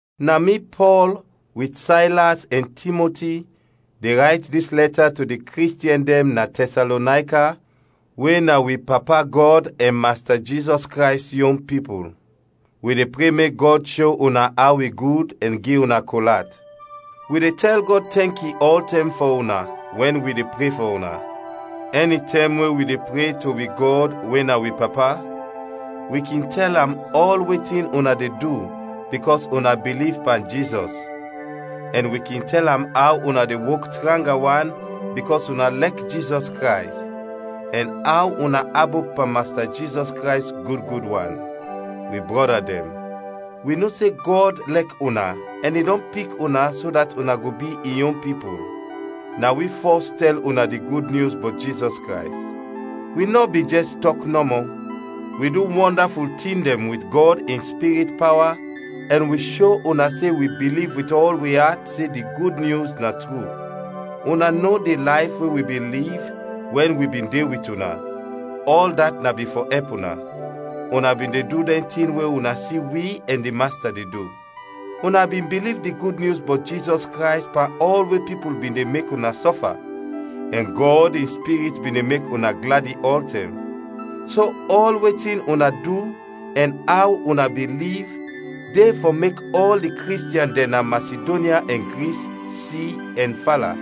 Na mi, Pɔl, wit Saylas ɛn Timoti, de rayt dis lɛta to di Kristiɛn dɛn na Tɛsalonayka we na wi Papa Gɔd ɛn Masta Jizɔs Krays yon pipul. Wi de pre mek Gɔd sho una aw i gud ɛn gi una kol at. Wi de tɛl Gɔd tɛnki ɔltɛm fɔ una wɛn wi de pre fɔ una. Ɛnitɛm we wi de pre to wi Gɔd we na wi Papa, wi kin tɛl am ɔl wetin una de du bikɔs una biliv pan Jizɔs, ɛn wi kin tɛl am aw una de wok tranga wan bikɔs una lɛk Jizɔs Krays, ɛn aw una abop pan Masta Jizɔs Krays gud gud wan. Wi brɔda dɛn, wi no se Gɔd lɛk una ɛn i dɔn pik una so dat una go bi in yon pipul. Na wi fɔs tɛl una di Gud Nyus bɔt Jizɔs Krays. Wi nɔ bin jɛs tɔk nɔmɔ, wi du wɔndaful tin dɛn wit Gɔd in Spirit pawa ɛn wi sho una se wi biliv wit ɔl wi at se di Gud Nyus na tru. Una no di layf we wi bin liv wɛn wi bin de wit una, ɔl dat na bin fɔ ɛp una. Una bin de du dɛn tin we una si wi ɛn di Masta de du. Una bin biliv di Gud Nyus bɔt Jizɔs Krays pan ɔl we pipul bin de mek una sɔfa, ɛn Gɔd in Spirit bin de mek una gladi ɔltɛm. So ɔl wetin una du ɛn aw una bin liv, de fɔ mek ɔl di Kristiɛn dɛn na Masidonya ɛn Gris si ɛn fala.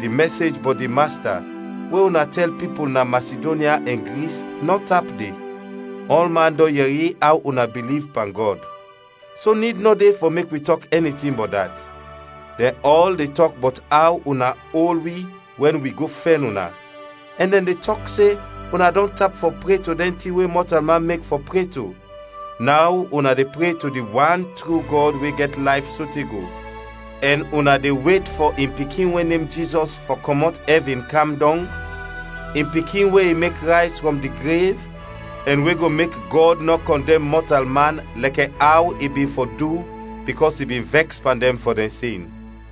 Di mɛsej bɔt di Masta we una tɛl pipul na Masidonya ɛn Gris nɔ tap de; ɔlman dɔn yɛri aw una biliv pan Gɔd. So nid nɔ de fɔ mek wi tɔk ɛni tin bɔt dat. Dɛn ɔl de tɔk bɔt aw una ol wi wɛn wi go fɛn una, ɛn dɛn de tɔk se una dɔn tap fɔ pre to dɛn tin we mɔtalman mek fɔ pre to, naw una de pre to di wan tru Gɔd we gɛt layf sote go, ɛn una de wet fɔ in Pikin we nem Jizɔs fɔ kɔmɔt ɛvin kam dɔng, in Pikin we i mek rayz frɔm di grev, ɛn we go mek Gɔd nɔ kɔndɛm mɔtalman lɛkɛ aw i bin fɔ du bikɔs i bin vɛks pan dɛn fɔ dɛn sin.